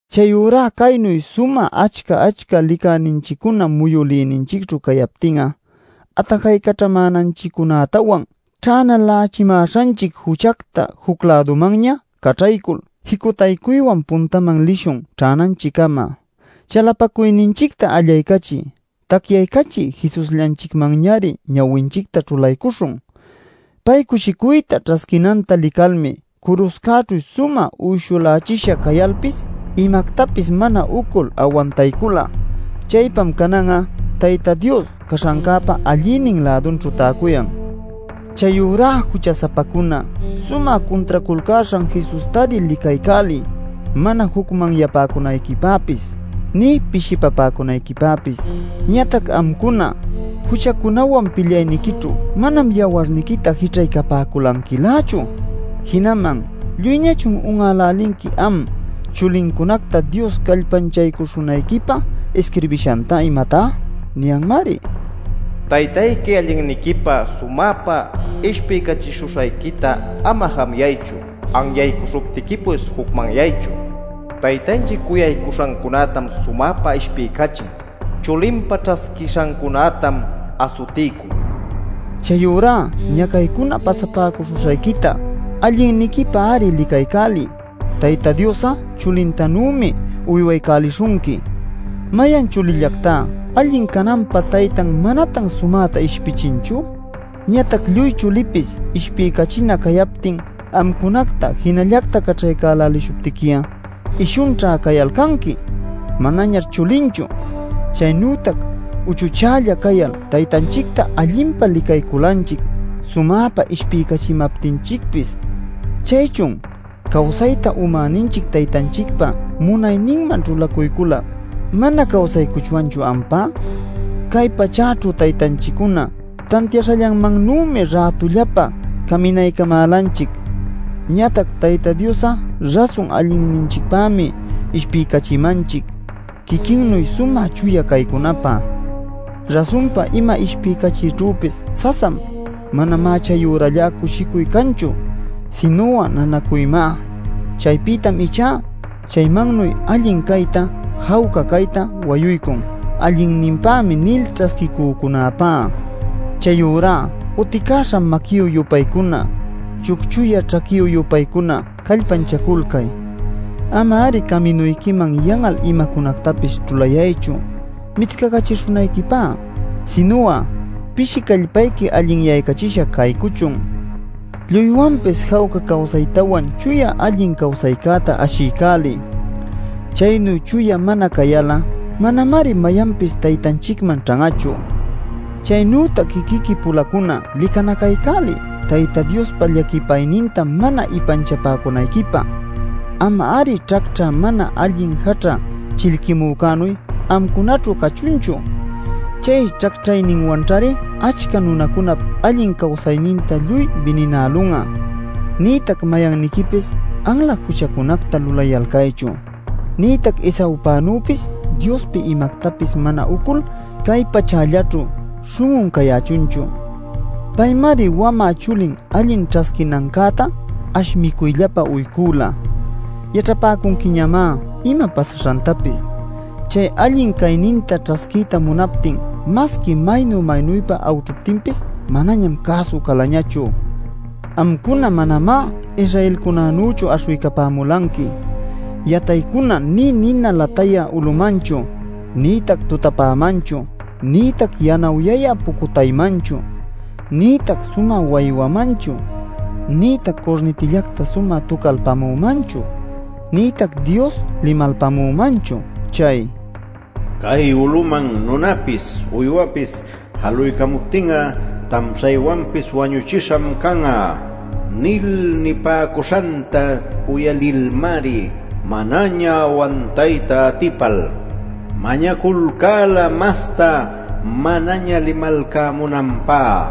Chayurá caynu sumä achca-achca licäninchiccuna muyülïninchicćhu cayaptin'a atajaycaćhamäninchiccunätawan, ćhänalächimäśhanchic juchacta juc-lädumanña caćhaycul, jicutaycuywan puntaman lishun ćhänanchiccama. Chalapacuyninchicta allaycachï, tacyaycachï Jesusllanchicmanñari ñawinchicta ćhulaycuśhun. Pay cushicuyta ćhasquinanta licalmi curuśhcäćhu sumä uyshulächisha cayalpis imactapis mana ucul awantaycula. Chaypam canan'a Tayta Dios caśhancäpa allïnin-lädunćhu täcuyan. Chayurá jucha-sapacuna sumä cuntraculcäśhan Jesustari licaycäliy mana jucmanyapäcunayquipäpis nï pishipapäcunayquipäpis. Ñatac amcuna juchacunäwan pilyayniquićhu manam yawarniquita jićhaycapäcunquilächu. Jinaman ¿lluyñachun un'älälinqui am chulincunacta Dios callpanchaycuśhunayquipä isquirbishanta, imatá? Niyanmari: “Taytayqui allinniquipä sumäpa ishpiycachishuśhayquita ama jamuyaychu, anyaycuśhuptiquipis jucmanyaychu. Taytanchic cuyaycuśhancunätam sumäpa ishpiycachin; chulinpä ćhasquishancunätam asutiycun” nil. Chayurá ñacaycuna pasapäcuśhuśhayquita allinniquipäri licaycäliy; Tayta Dios'a chulintanümi uywaycälishunqui. ¿Mayan chulillactá allin cananpä taytan manatan sumäta ishpichinchu? Ñatac lluy chulipis ishpiycachina cayaptin amcunacta jinallacta caćhaycälälishuptiqui'a ishunćha cayalcanqui; manaćhá chulinchu. Chaynütac uchuchälla cayal taytanchicta allinpa licayculanchic sumäpa ishpiycachimaptinchicpis. Chaychun ¿cawsayta umäninchic taytanchicpa munayninman ćhulacuycul-lä mana cawsaycuchwanchu ampá? Cay pachäćhu taytanchiccuna tantiaśhallanmannümi rätullapä caminaycamälanchic. Ñatac Tayta Dios'a rasun allinninchicpämi ishpiycachimanchic, quiquinnuy sumä chuya caycunapä. Rasunpa ima ishpiycachiyćhüpis sasam; manamá chayurallá cushicuy canchu, sinu'a, nanacuymá. Chaypïtam ichá chaymannuy allin cayta, jawca cayta wayuycun “allinnïpämi” nil ćhasquiycücunäpá. Chayurá uticäśha maquiyü-yupaycuna, chucchuyä ćhaquiyü-yupaycuna, callpanchaculcay. Ama-ari caminuyquiman yan'al imacunactapis ćhulayaychu mitcacacachishunayquipá. Sinu'a pishi callpayqui allinyaycachisha caycuchun. Lluywanpis jawca cawsaytawan chuya allin cawsaycäta ashiycäliy. Chaynu chuya mana cayal'a manamari mayanpis Taytanchicman ćhan'achu. Chaynütac quiquiqui-pulacuna licanacaycäliy Tayta Diospa llaquipayninta mana ipanchapäcunayquipä. Ama-ari ćhacćhä mana allin jaćha chillquimücänuy amcunaćhu cachunchu. Chay ćhacćhayninwanćhari achca nunacunap allin cawsayninta lluy bininälun'a. Nïtac mayanniquipis anla juchacunacta lulayalcaychu, nïtac Esaüpanüpis Diospi imactapis mana ucul cay pachällaćhu śhun'un cayächunchu. Paymari wamä chuli allin ćhasquinancäta ash micuyllapä uycüla. Yaćhapäcunquiñamá ima pasaśhantapis: chay allin cayninta ćhasquiyta munaptin masqui maynu-maynüpa awćhuptinpis manañam cäsu calañachu. Amcuna manamá Israelcunänüchu aśhuycapämulanqui yataycuna nï nina latayä ulumanchu, nïtac tutapämanchu, nïtac yanawyayä pucutaymanchu, nïtac sumä waywamanchu, nïtac curnitillacta sumä tucalpamümanchu, nïtac Dios limalpamümanchu. Chay “¡Cay uluman nunapis uywapis jaluycämuptin'a tamshaywanpis wañüchisham can'a!” nil nilpamuśhanta uyalilmari, manaña awantayta atipal, mañaculcäla masta manaña limalcamunanpä.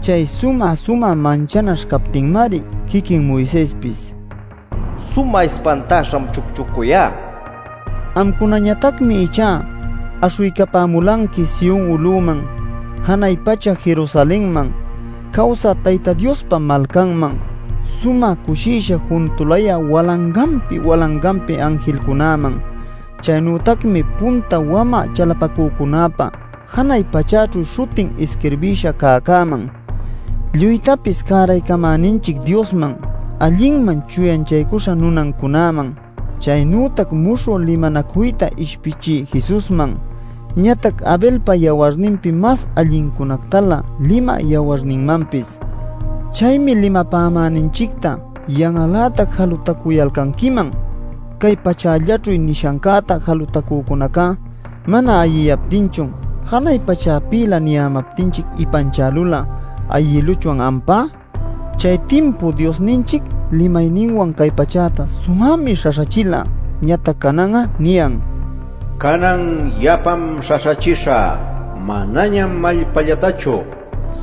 Chay sumä-sumä manchanaśh captinmari quiquin Moisespis “Sumä ispantäśham chucchucuyá” nila. Amcunañatacmi ichá aśhuycapämulanqui Sion uluman, janay pacha Jerusalenman, cawsä Tayta Diospa malcanman, sumä cushisha juntulayä walanganpi-walanganpi anjilcunäman. Chaynütacmi punta wamä chalapacücunäpä janay pachäćhu śhutin isquirbïsha cäcäman, lluytapis cäraycamäninchic Diosman, allinman chuyanchaycuśha nunancunäman. Chaynütac muśhü limanacuyta ishpichï Jesusman, ñatac Abelpa yawarninpi mas allincunactalä limä yawarninmanpis. Chaymi limapämäninchicta yan'al-lätac jalutacuyalcanquiman. Cay pachällaćhu nishancäta jalutacücunäca mana ayiyaptinchun ¿janay pachäpïlä niyämaptinchic ipanchälul'a ayïluchwan, ampá? Chay timpu Diosninchic limayninwan cay pachäta sumämi śhaśhächila. Ñatac canan'a niyan: “Canan yapam śhaśhachishä, manañam allpällactachu,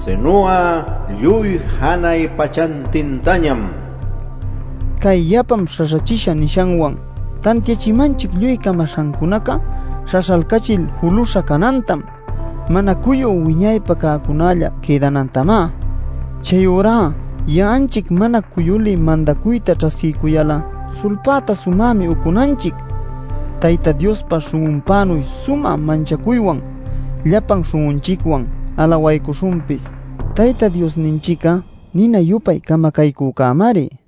sinu'a lluy janay pachantintañam” nil. Cay “yapam śhaśhachishä” nishanwan tantiachimanchic lluy camaśhancunaca śhaśhalcachil julüśha canantam, mana cuyü wiñaypä cäcunalla quïdanantamá. Chayurá ya'anchic mana cuyulï mandacuyta ćhasquiycuyal'a sulpäta sumämi ucunanchic; Tayta Diospa śhun'unpänuy sumä manchacuywan llapan śhun'unchicwan alawaycuśhunpis. Tayta Diosninchic'a nina-yupay camacaycücämari.